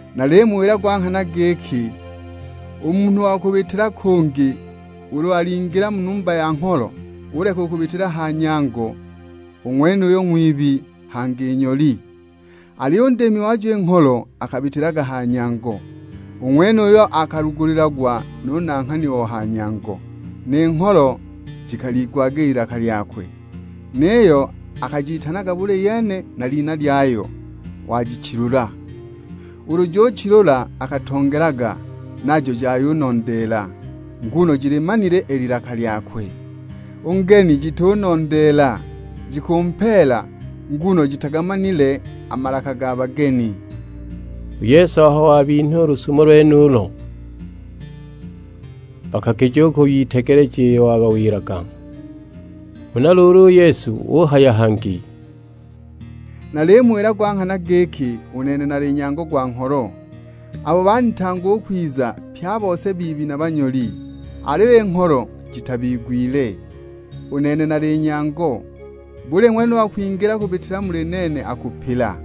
"Nalimuwila gwa nghana giki, u munhu wa kubitila kungi ulu alingila mu numba ya ngholo, uleka kubitila ha nyango, u ng'wenuyo ng'wibi; hangi nyoli. Aliyo u ndiimi wajo i ngholo akabitilaga ha nyango. U ng'wenuyo akalugulilagwa nu nanghani o ha nyango, ni ngholo jikaliigwaga i lilaka lyakwe, niyo akajitanaga buli yene na lina lyayo, wajichilula. Ulu ujichilula akatongelaga, najo jayunondeela, nguno jilimanile i lilaka lyakwe. U ngeni jitunondeela, jikumpeela nguno jitagamanile a malaka ga bageni." U Yesu aho wabinha u lusumo lwenulo, bakakija u kwiyitegeleja iyo wabawilaga. Huna luulu u Yesu uhaya hangi, "Nalimuwila gwa nghana giki, u nene nali Nyango gwa ngholo. Abo baanitanga u kwiza, pye a bose biibi na banyoli; aliyo i ngholo jitabigwile. U nene nali Nyango, buli ng'wene u wa kwingila kubitila muli nene akupila;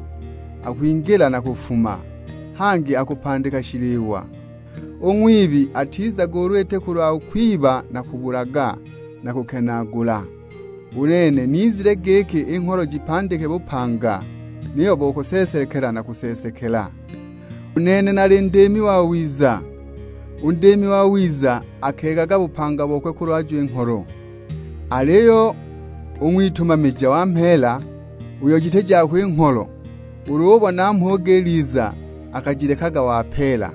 akwingila na kufuma, hangi akupandika shiliwa. U ng'wibi atizaga ulu iti kulwa kwiba na kubulaga, na kukenaagula. U nene nizile giki i ngholo jipandike bupanga, niyo bo kuseesekela na kuseesekela! U nene nali Ndiimi wawiza; u ndiimi wawiza akeegaga bupanga bokwe kulwajo i ngholo. Aliyo u ng'witumamija wa mheela, uyo jiti jakwe i ngholo, ulu ubona mhuge iliza akajilekaga wapeela.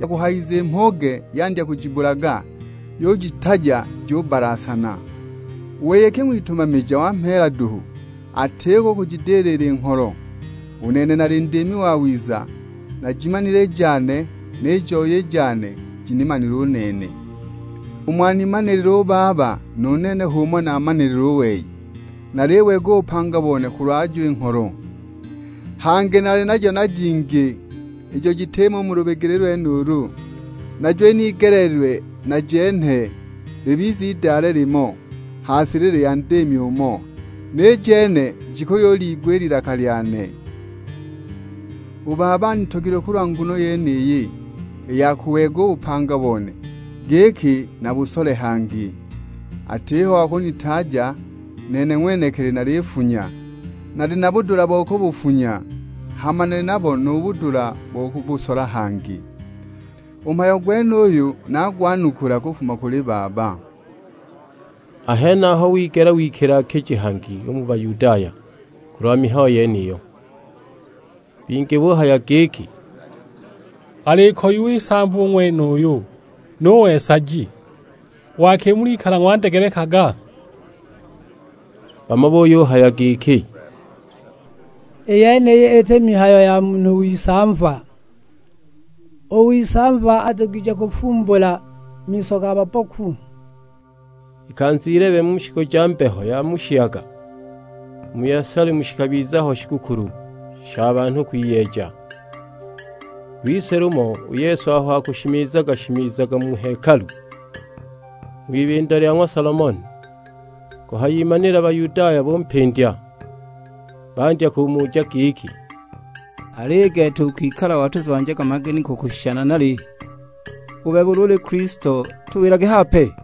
Yakuhayushika i mhuge yandya kujibulaga, yujitaja jubbalasana! U wei iki ng'witumamija wa mheela duhu, atiko u kujidilila i ngholo. U nene nali Ndiimi wawiza; najimanile i jane, ni joi i jane jinimanile u nene. Umo animanilile u Baba, nu nene h'umo naamanilile u wei; na naliweega u bupanga bone kulwajo i ngholo. Hangi nali najo na jingi, ijo jitimo u mu lubigili lwenulu; najo inigeleelilwe najenhe, libize idale limo, ha silili ya Ndiimi umo. Ni jene jikuyuliigwa i lilaka lyane. U Baba anitogilwe kulwa nguno yeniyi, i ya kuweega u bupanga bone, giki nabusole hangi. Atiho wa kunitaaja; nene ng'wenekili nalibufunya, nali na budula bo kubufunya, hama nali nabo nu budula bo kubusola hangi. U mhayo gwenuyu nagwanukula kufuma kuli Baba." A henaho wigela wikila-kiji hangi u mu Bayudaya kulwa mihayo yeniyo. Bingi buhaya giki, "Alikoyiwa isamva u ng'wenuyu; nuwe nsaji, waki mulikala ng'wandegelekaga?" Bamo buyuhaya giki, "I yeniyi iti mihayo ya munhu w'isamva; u w'isamva adugije kufumbula miso ga babboku?" Ikanza ilebe mu shiku ja mbeho ya mu shiyaga, u mu Yelusalemu shikabiza ho shigukulu sha banhu kwiyeeja. Lwise lumo u Yesu aho akushimiza-shimizaga mu hekalu, ng'wibindo lya ng'wa Solomoni, kuhayimanila Bayudaya bampindya; bandya kumuja giki, "Aliyo i gete ukwikala watuzwanjaga maganiko kushisha nanali? U bebe ulu uli Kilisto tuwilage hape!"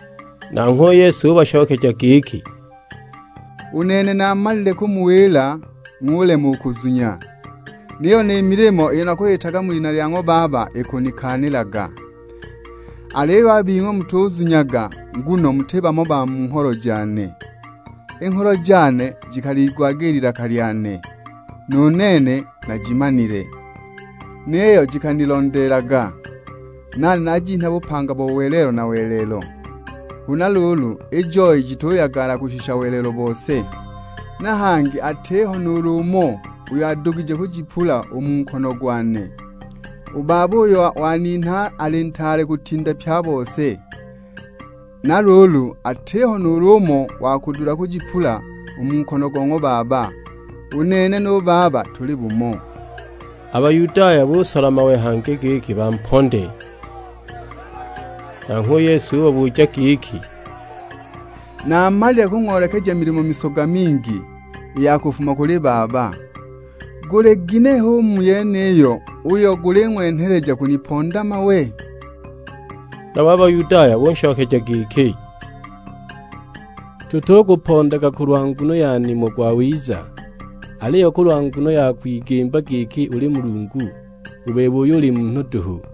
Nanghwe u Yesu ubashokeja giki, "U nene naamalile kumuwila ng'ulema u kuzunya. Niyo ni milimo iyo nakuyitaga mu lina lya ng'wa Baba ikunikaanilaga. Aliyo a bing'we mutuzunyaga nguno muti bamo ba mu ngholo jane. I ngholo jane jikaliigwaga i lilaka lyane, nu nene najimanile; niyo jikanilondeelaga, nane najinha bupanga bo welelo na welelo. Huna luulu i joi jituyagala kushisha welelo bose; na hangi atiho nuulu umo uyo adugije kujipula u mu nkono gwane. U Baba uyo waninha ali ntaale kutinda pye a bose, na luulu atiho nuulu umo wa kudula kujipula u mu nkono go ng'wa Baba. U nene nu Baba tuli umo." A Bayudaya busola mawe hangi giki bamponde. Nanghwe u Yesu ubabuja giki, "Naamalile kung'oolekeja milimo misoga mingi i ya kufuma kuli Baba; guli ginehe u mu yeniyo uyo guling'wenheleja kuniponda mawe?" Nabo a Bayudaya bunshokeja giki, "Tutukupondaga kulwa nguno ya nimo gwawiza, aliyo kulwa nguno ya kwigimba giki uli Mulungu; u bebe uyo uli munhu duhu!"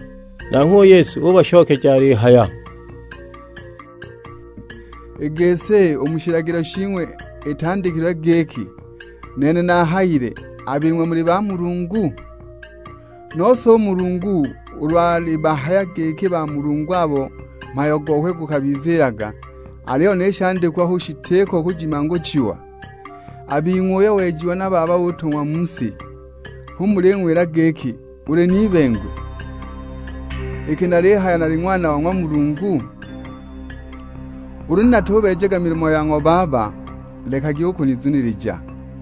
Nanghwe u Yesu ubashokeja alihaya, "I gisi u mu shilagilo shing'we itandikilwe giki, 'Nene nahayile, a bing'we muli bamulungu?' Nose u Mulungu ulu alibahaya giki bamulungu abo mhayo gokwe gukabiziilaga, aliyo ni shandikwa hu shitiko kujimanguchiwa, a bing'we uyo wejiwa na Baba utung'wa mu si, hu muling'wila giki, 'Uli n'ibengwe;' iki nalihaya nali Ng'wana wa ng'wa Mulungu? Ulu natubeejaga milimo ya ng'wa Baba lekagi u kunizunilija.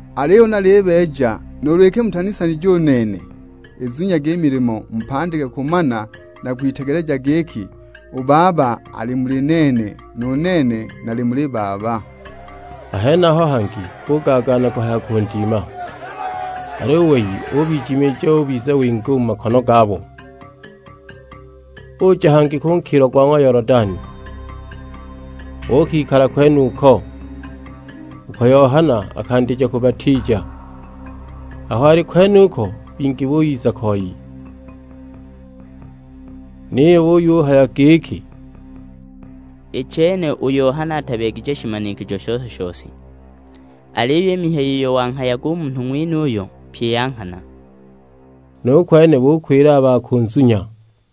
Aliyo ulu nalibeeja, nuulu iki mutunisanyaga u nene, izunyagi i milimo mupandike kumana na kwitegeleja giki u Baba ali muli nene, nu nene nali muli Baba!" A henaho hangi bugaagaana kuhaya kundima, aliyo u wei ubijimiija ubiza winga u mu makono gabo. Uja hangi ku nkilo gwa Yolodani, uukikala kwenuko; uko Yohana akandija kubatiija. Aho ali kwenuko bingi buyiza koi, niyo buyuhaya giki, "I chene u Yohana atabeegije shimanikijo shose-shose, aliyo i mihayo iyo wanghayaga u munhu ng'wenuyu, pyi ya nghana!" Nu kwene bukwila a ba kunzunya.